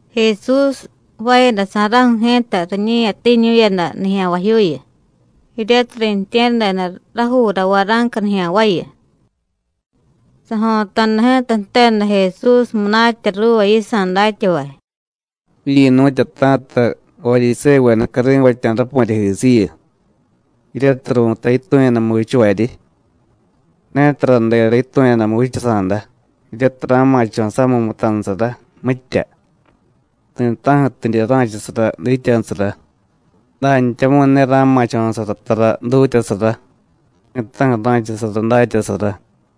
Jesús jvaayadasa̱ra̱ju̱ ji̱ta riñe̱yatiiñu̱yada nijya̱nvajyuuyu, jiryatiy riintye̱ryadeda rajuura vara̱nca nijya̱nvayu. Sajo̱ta̱da ji̱ta jteda Jesús munatya ruuva yisa̱ datyavay: “Jiryi̱nu̱tyata̱ta Varyisévuveda cari̱vatya̱ rapu̱ryajisiyu, jiryatiy ru̱tay yitu̱yadamu vichavaryi. Ne taradera yitu̱yadamu vichasa̱da jiryatiy ra̱ma̱cho̱ samiy mutanusara, mitya; ti̱ta̱ju̱tidye ra̱chasara dityanusara; dantyamu̱y ne ra̱ma̱cho̱sara tara dutyasara, ti̱ta̱ju̱ ra̱chasara datyasara.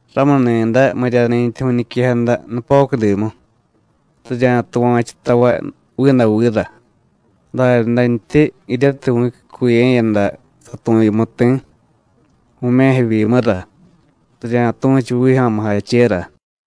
Ramuni̱day, miryani̱ntyi vu̱ñiquejada nupocudimu, rirya̱tuva̱chu tavay vidavira; daryadantyi, jiryatiy vu̱cyucuye̱yada tu̱yumu ti̱, vu̱me̱jevyimura, rirya̱tu̱chu vijyo̱mujachera.”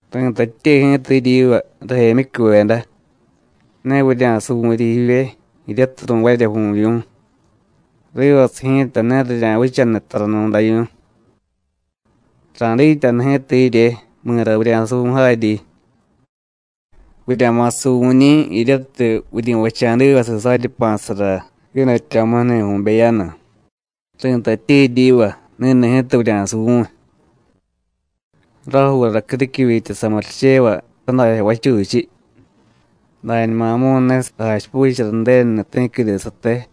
“Ri̱tatye ji̱ta jiryiva, rajemyicyuveda: Ne vurya̱suvu̱ryi jivye, jiryatiy ru̱varya vu̱vyu̱, rivasiy ji̱ta ne rirya̱vichaniy taranu̱davyu̱y. Ra̱dityanu ji̱ta jirye mi̱ra vurya̱suvu̱y jaryi. Vurya̱ma̱ suvu̱ñi̱ jiryatiy vuryi̱vacha̱divasiy saryi jpa̱sara jiidatyo̱muju̱ni̱ vu̱beyanu. Ri̱tatye jiryiva: Ni̱ni̱ ji̱ta vurya̱suvu̱y. Rajuura criquivyitya samurichevay tadajyo vachuchiy, dañumamu̱y ne sajachipuchara Ju̱denuni̱ ti̱quide sate.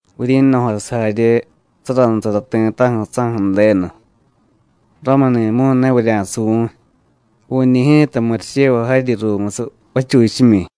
Vuryi̱no̱jasiy jarye saranusara ti̱ta̱ju̱ saju̱ Ju̱denu. Ramuni̱mu̱y ne vurya̱suvu̱y; vu̱ñi̱ ji̱ta murichevay jaryi ruumusiy vachuchimyi.”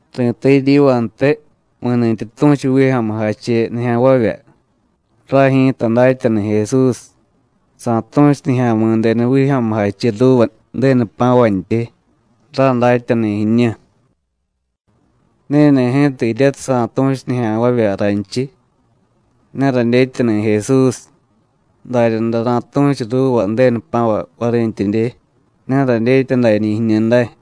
“Ri̱tay jiryivantiy: Mi̱ni̱tyi tu̱chu vijyo̱mujache nijya̱nvavya: Ray ji̱ta datyani̱ Jesús, sa̱tu̱chu Nijya̱mi̱denu vijyo̱mujache ruuva Ju̱denu jpa̱vantyi: Ray datyani̱ jiñu. Ni̱ni̱ ji̱ta jiryatiy sa̱tu̱chu nijya̱nvavya raynchiy: Ne radyetyani̱ Jesús, daryaday ra̱tu̱chu ruuva Ju̱denu jpa̱vay varintyidye: Ne radyetya dañi̱ jiñu day.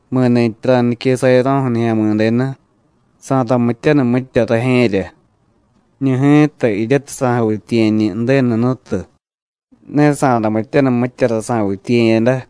Mi̱nintyi ra̱nique sayaro̱ju̱ Nijya̱mi̱denu, sa̱ramityaniy mitya rajye̱rya. Jiñu ji̱ta jiryatiy sa̱javityiye̱ñi̱ Ju̱denu Jnutu, ne sa̱ramityaniy mityara sa̱vityiye̱yada.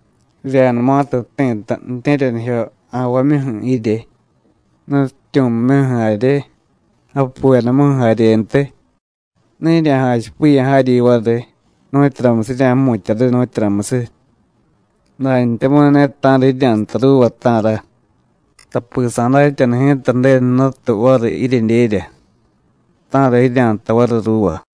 Rirya̱numatiy jti̱ta ju̱tye̱ryanijyo ja̱nvamyuju̱ jirye, nutyityu̱mimyuju̱ jarye, japuvedamuju̱ jaryentiy, ne jirya̱jachipiya̱ jaryi variy nu̱tyuramusiy jirya̱jmutya̱ riy, nu̱tyuramusiy, dantyamu̱y ne ta̱ra jirya̱jtay ruuva, ta̱ra, tapi sa̱datyanu ji̱ta Ju̱denu Jnutu variy jiryedyerya, ta̱ra jirya̱jtay variy ruuva.”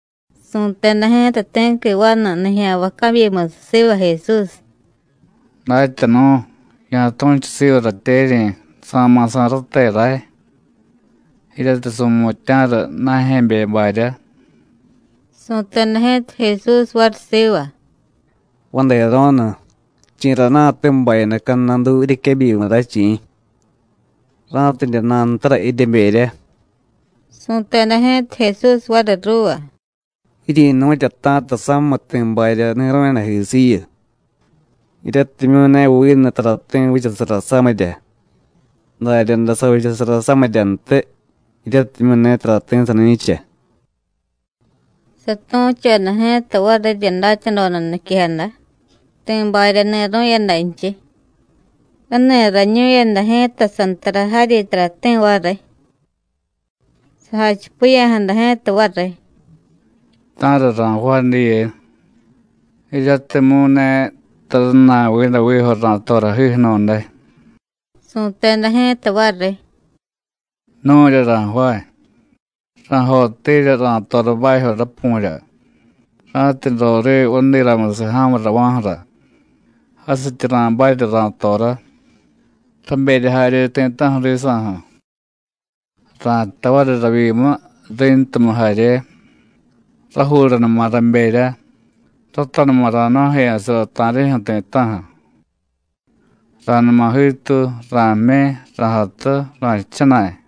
Su̱teda ji̱ta ti̱qui vanu nijya̱nvay cabyimusiy siva Jesús: “Datyanu̱, ya̱tu̱chu siva ratyeryi̱ sa̱ma̱ sa̱y rate ray, jiryatiy su̱mutya̱ra na̱jye̱be barya.” Su̱teda ji̱ta Jesús variy siva: “Vadero̱nu, ¿chi̱rana̱te bayada cadnadu jiryequebyimu ray, chi̱? ra̱tidye nantara jiryeberya.” Su̱teda ji̱ta Jesús variy ruuva: “Jiryi̱nu̱tyata̱ta samiy ti̱ barya ni̱ru̱yadajisiyu, jiryatimyu̱ ne vinu tarati̱ vichasara samirya. Daryaday savichasara samiryantiy, jiryatimyu̱ ne tarati̱ sani̱cha.” Satu̱choda ji̱ta varirya datyadoda niquejada ti̱ barya ni̱ru̱yadanchiy: “Rani̱rañu̱yada ji̱ta sántará jaryi tarati̱ variy. Sajachipiya̱jada ji̱ta variy: Ta̱ra ra̱jvaay diye, jiryatimyu̱ ne tara jna̱y vidavijo ra̱torajiju̱nu̱day. Su̱teda ji̱ta variy: Nu̱rya ra̱jvaay. Ra̱jottirya ra̱tora bajyo rapu̱rya, ra̱tidye roriiy vadiramusiy ja̱murava̱ju̱ra, jasityi ra̱barya ra̱torá, raberya jarye ti̱ta̱ju̱ risa̱ju̱. Ra̱jtay variy ravyimu, ri̱ntumu jarye: Rajuuranuma raberya, ratanuma ra̱jnu̱jeya̱sara ta̱rijyu̱ ti̱ta̱ju̱. Ra̱numa jiituy, ra̱jmyi, ra̱jatu, ra̱jchana̱y.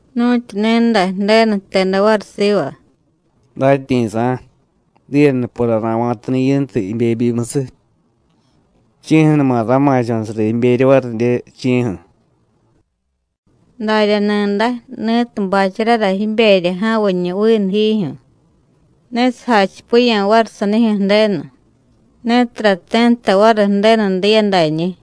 Nu̱tyu ni̱day Ju̱denu jteda variy siva: ‘¡Datyi̱sa̱! Diye nupora ra̱va̱tani̱ yintu jibebyimusiy. ¿Chi̱ju̱numa ra̱ma̱cho̱sara jiberya varidye, chi̱ju̱?’ Darya ni̱day, ni̱tiy bacharara jiberya ja̱viñu vinu jijyu̱, ne sajachipiya̱ variy sanijyu̱ Ju̱denu, ne tarati̱ nta variy Ju̱denu diya dañi̱.”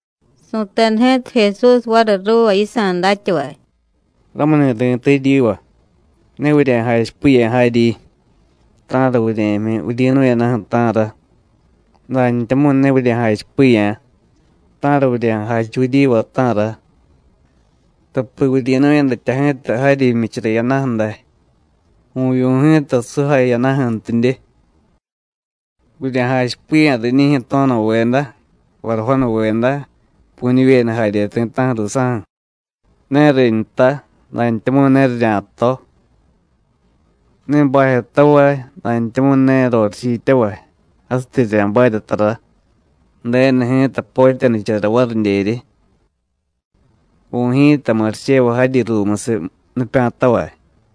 Su̱teda ji̱ta Jesús variy ruuva yisa̱ datyavay: “Ramuni̱ ri̱tay jiryiva: Ne vurya̱jachipiya̱ jaryi: ¿Ta̱ra vurye̱jmyi vuryi̱nu̱yadaju̱, ta̱ra? dantyamu̱y ne vurya̱jachipiya̱: ¿Ta̱ra vurya̱jachu vuryiva, ta̱ra? Tapi vuryi̱nu̱yadatya ji̱ta jaryi jmyichara jiyadaju̱ day, vu̱vyu̱ ji̱ta sujay jiyadaju̱ntidye. Vurya̱jachipiya̱ riñijyu̱ to̱no̱veda, varajonuveda, pu̱ñivyeda jarye ti̱ta̱ju̱ ruusa̱ju̱: ne rinta, dantyamu̱y ne rirya̱to. Ne bajyotavay, dantyamu̱y ne rorichityavay, jasityi rirya̱barya tara. Ju̱denu ji̱ta potyanichara varidyeryi. Vu̱y ji̱ta murichevay jaryi ruumusiy nipya̱tavay.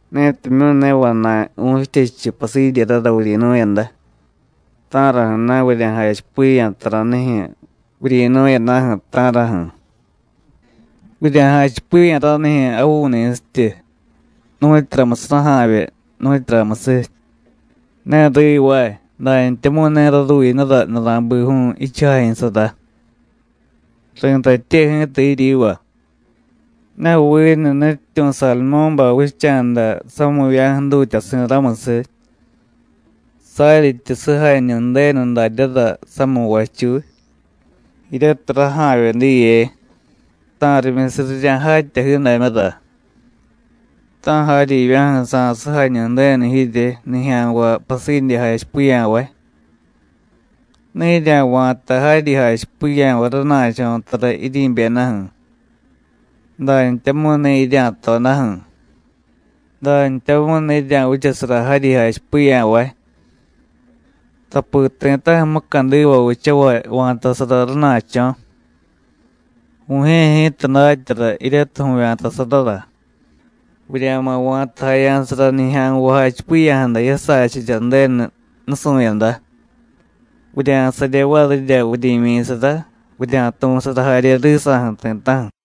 Netimyu̱ ne vana̱y vu̱chityechu pasidyerara vuryi̱nu̱yada, ¿ta̱raju̱na̱ vurya̱jachipiya̱ taranijyu̱ vuryi̱nu̱yadaju̱, ta̱raju̱? Vurya̱jachipiya̱ ranijyu̱ javu̱ñi̱sityu, nu̱tyuramusiy raja̱vye, nu̱tyuramusiy. Ne rivaay, dantyamu̱y ne raruyinura nura̱biju̱u̱ jichujajyu̱sara; ri̱tatye ji̱ta jiryiva: ne vinu nutyityu̱ Sadumú̱bay vicha̱da sami̱va̱ju̱ dutyasi̱ ramusiy. Saryityi sujañu Ju̱denu daryára samiy vachuy jiryatiy raja̱vye diye, ta̱rimyusiy rirya̱jatya jiidamyura, ta̱ jaryivya̱ju̱ sa̱sujañu Ju̱denu jirye, nijya̱nvay pasidye jachipiya̱vay. Ne jirya̱va̱ta jaryi jachipiya̱vay rana̱cho̱ tara jiryi̱byedaju̱, dantyamu̱y ne jirya̱todaju̱; dantyamu̱y ne jirya̱vichasara jaryi jachipiya̱vay. Tapi ti̱ta̱ju̱ mucadiva vichavay va̱tasara rana̱cho̱. Vu̱jye̱ ji̱ta datyara jiryatiy vu̱vya̱tasarara. Vurya̱ma̱ va̱tajaya̱sara nijya̱nvay jachipiya̱jada jiyasachirya Ju̱denu nusu̱yada, vurya̱sarye varirya vuryi̱myi̱sara, vurya̱tu̱sara jarye risa̱ju̱ ti̱ta̱ju̱.”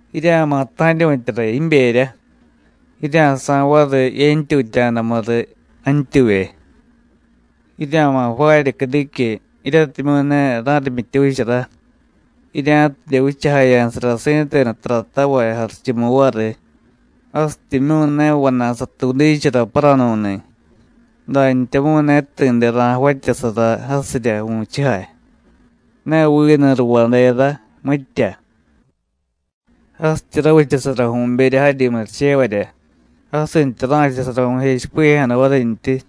Jirya̱ma̱ ta̱ryu̱tyara jiberya, jirya̱sa̱y variy yentyutya̱damu riy jantyuvye. Jirya̱ma̱ jvaarya criquiy jiryatimyu̱ ne ra̱rimyityuuchara, jirya̱tidye vichajaya̱sara si̱tenu taratavay jarichumu variy, jasityimyu̱ ne vana̱y satuudichara paranu̱ni̱, dantyamu̱y ne ti̱de ra̱javatyasara jasirya vu̱chujay, ne vinu ruvádera, mitya. Jasityi ravichasara vu̱berya jaryi murichevarya, jasintya ra̱chasara vu̱jechipiya̱jada varintyi.”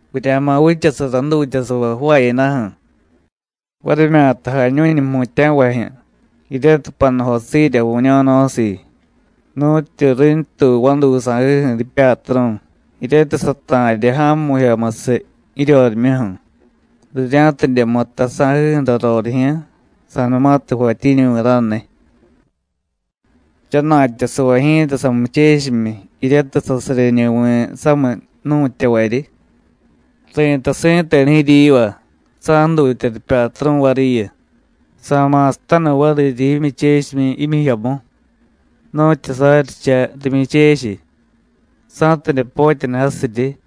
“Vurya̱ma̱ vichasara jdutyasavay jvaayadaju̱, varimyata jañu̱ñu jmutya̱vajyu̱, jiryatiy panujosiirya vu̱ño̱no̱siiy, nu̱tyu rintuy vaduy sa̱jiju̱ jipyatru̱, jiryatiy sata̱rya ja̱mu̱jyomusiy jiryorimyuju̱, rirya̱tidye mutta sa̱jiju̱ra rorijyu̱, sa̱numatiy jvatyiñuvi̱ raniy. Jchana̱tyasavay ji̱ta samuchechimyi, jiryatiy sasaryeñuvi̱ samiy jnu̱tyavaryi. Ri̱tay si̱tenu jiryiva, sa̱jdutya ripyatru̱ variyu, sa̱ma̱sataniy variryi jimyuchechimyi jmyijyomu, nu̱tyu saryicha rimyuchechiy, sa̱tidye potyaniy jasiryi.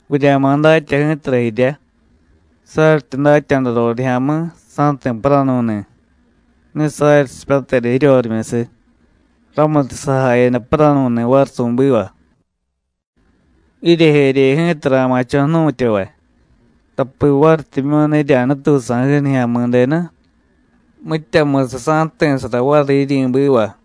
Vurya̱ma̱ datya ji̱tara jirya. Saryityi datya̱da rorijya̱mi̱: Sa̱jti̱ paranu̱ni̱, ne saryi sipyateda jiryorimyusiy, ramutiy sajayada paranu̱ni̱ variy su̱biva. Jiryejerye ji̱ta ra̱ma̱cho̱ jnu̱tyavay, tapi varityimyu̱ ne jirya̱nutuy sa̱jiju̱ Nijya̱mi̱denu, mityamusiy sa̱jti̱sara variy jiryi̱biva.”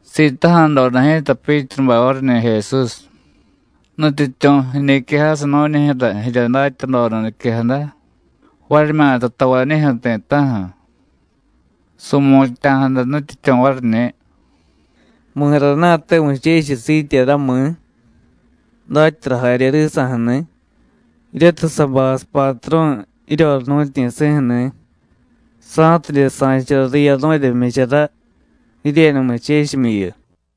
Sitaja̱doda ji̱ta Pyítrubay variñi̱ Jesús: “¿Nutyityu̱, jiñiquejasiy nu̱ñijyu̱ra jirya datyadoda niquejada, varimyata tavañijyu̱ ti̱ta̱ju̱?” Su̱mutya̱jada Nutyityu̱ variñi̱: “¿Mi̱rana̱te muchechiy siityera, mi̱? datyara jarye risa̱ju̱ni̱, jiryatiy sa̱bay sapatru̱ jiryoriy jnu̱tyi̱si̱ju̱ni̱, sa̱tidye sa̱chara riyaru̱rya jmyichara jiryenu muchechimyiyu.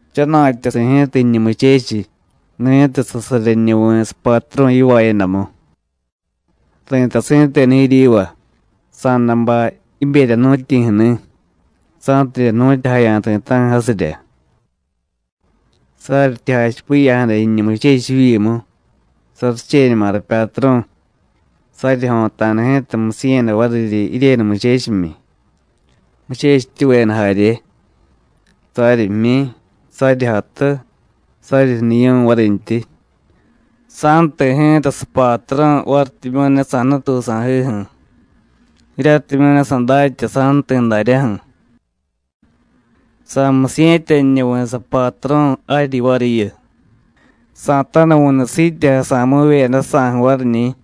Jchana̱tyasi̱ ji̱ta jiñu muchechiy, ni̱tiy sasaryenuvi̱ sapatru̱ yivaayadamu. Ri̱tay si̱tenu jiryiva: Sa̱day bay jiberya jnu̱tyi̱ju̱ni̱, sa̱tidye jnu̱tyajaya̱ ti̱ta̱ju̱ jasirya. Saryityi jachipiya̱jada jiñu muchechiy jivyimu: Saricheñuma rapyatru̱, saryijyo̱ta̱da ji̱ta musiye̱yada variryi jiryenu muchechimyi, muchechityuveda jarye, saryi jmyi, saryi jatu, saryi jniyu̱y varintyi, sa̱jti̱ ji̱ta sapatru̱ varityimyu̱ ne sa̱nutuy sa̱jiju̱, jiryatimyu̱ ne sadatya sa̱jti̱ daryaju̱. Sa̱musiye̱tyaniñuvi̱ sapatru̱ jaryi variyu, sa̱tanuvu̱nu siityejasa̱mivyeda jsa̱ju̱ variñi̱.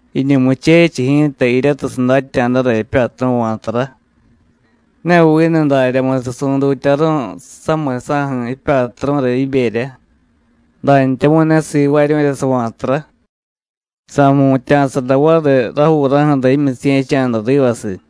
Jiñu muchechiy ji̱ta, jiryatiy sadatya̱dara jipyatru̱ va̱tara, ne vinu daryamusiy su̱dutyaru̱y samiy saju̱ jipyatru̱ra jiberya, dantyamu̱y ne sivaaryu̱rya sava̱tara, sa̱jmutya̱sara variy rajuuraju̱ra jimyusiye̱cha̱da rivasiy.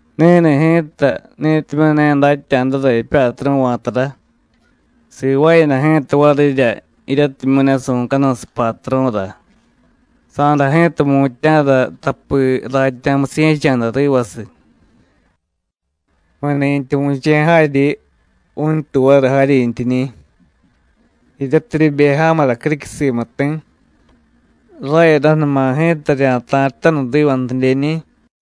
Ni̱ni̱ ji̱ta ni̱timyu̱ ne datya̱dara jipyatru̱ va̱tara, sivaayada ji̱ta varirya jiryatimyu̱ ne su̱canuy sapatru̱ra, sa̱day ji̱ta jmutya̱ra tapi ratya̱ musiye̱cha̱da rivasiy. Mi̱ni̱tyi vu̱che̱y jaryiñi̱, vu̱ntuy variy jaryintyiñi̱. Jiryatiy ribe ja̱mura criquiy simu ti̱, rayadaju̱numa ji̱ta rirya̱murichenutaniy rivantidyeñi̱.”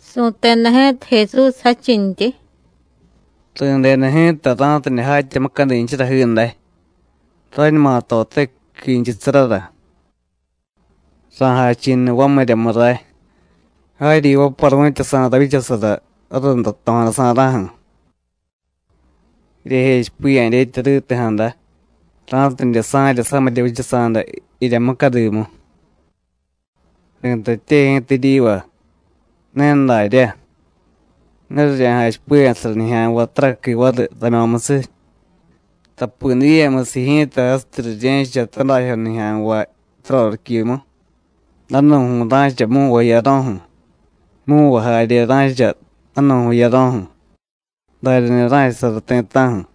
Su̱teda ji̱ta Jesús jadchintyi: “Ri̱deda ji̱ta ra̱tidye jatya mucadinchara jiiday, rañuma tote ji̱quinchusarara. ¡Ra̱jachi̱niy vamiryamu ray, jaryi vaparu̱tyasa̱ ravyichasara rarunda jto̱jadasa̱ra̱ju̱! Jiryejechipiya̱ dyetya riti̱jada ra̱tidye sa̱rya samirya vichasa̱da jirya mucadimu. Ri̱tatye ji̱ta jiryiva: Ne daryá, ne rirya̱jachipiya̱sara nijya̱nvay taraqui variy ramyo̱musiy, tapi diyemusiy ji̱ta jasityi rirye̱cha tadajyo nijya̱nvay taroriquimu, danu̱ju̱y ra̱cha mu̱nvay jiyaro̱ju̱, mu̱nvay jarye ra̱cha danu̱ju̱y jiyaro̱ju̱, daryani̱ ra̱chasara ti̱ta̱ju̱.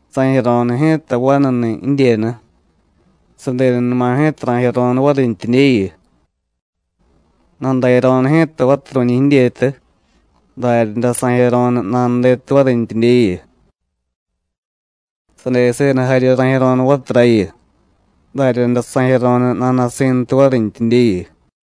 Sa̱jiyaro̱nu ji̱ta vanuni̱ jidyenu, sadenunuma ji̱ta ra̱jiyaro̱nu varintyidyeyu. Nadayaro̱nu ji̱ta vaturu̱ñi̱ jidyetu, daryaday sa̱jiyaro̱nu nanudetu varintyidyeyu. Sadeseda jarye ra̱jiyaro̱nu vaturayu, daryaday sa̱jiyaro̱nu nana̱si̱ntu varintyidyeyu.”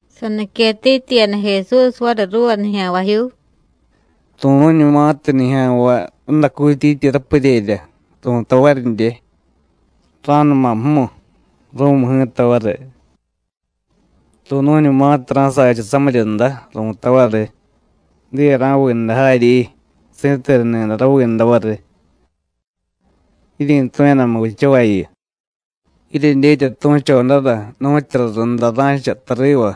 Saniquetityiyada Jesús variy ruuva nijya̱nvajyuu: “Ru̱nu̱ñumatiy nijya̱nvay radacutyityi rapuryerya, ru̱tay varidye: Ra̱numa jmu, ru̱mu ji̱ta variy. Ru̱nu̱ñumatiy ra̱sacha samiryunda, ru̱tay variy: Diye ra̱viiday jaryi, si̱tenuni̱day raviiday variy. ¡Jiryi̱tu̱yadamu vichavayu! Jiryedyetya tu̱chodara nu̱tyura runda ra̱cha tariva,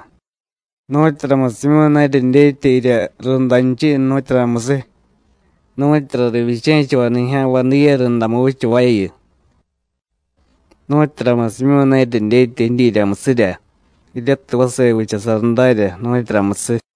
¿nu̱tyuramusimyu̱ ne jiryedyetya jirya rundanchiy, nu̱tyuramusiy? nu̱tyura rivyiche̱chavay nijya̱nvay diye rundamu vichavayu. ¿Nu̱tyuramusimyu̱ ne jiryedyetya jidyiryamusirya jiryatiy vase vichasara darya, nu̱tyuramusiy?”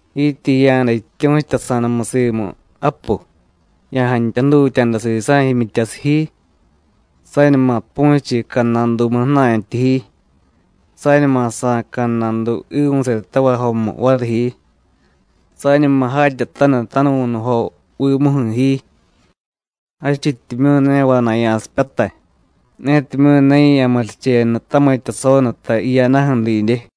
“Jityi jiya̱da jityu̱chutasa̱damu simu japu, ya̱jantya jdutya̱da sisa̱ jimyityasiy ji, sañuma pu̱chiy cadnadumu ju̱na̱ntyi ji, sañuma sa̱y cadnadu jiivu̱setavay jomu variy ji, sañuma jatyataniy tanuvu̱nujovimuju̱ ji, jadchityimyu̱ ne vana̱y ya̱sipyatay netimyu̱ ne ya̱murichenu tamitya sonuta jiyadaju̱ didye.”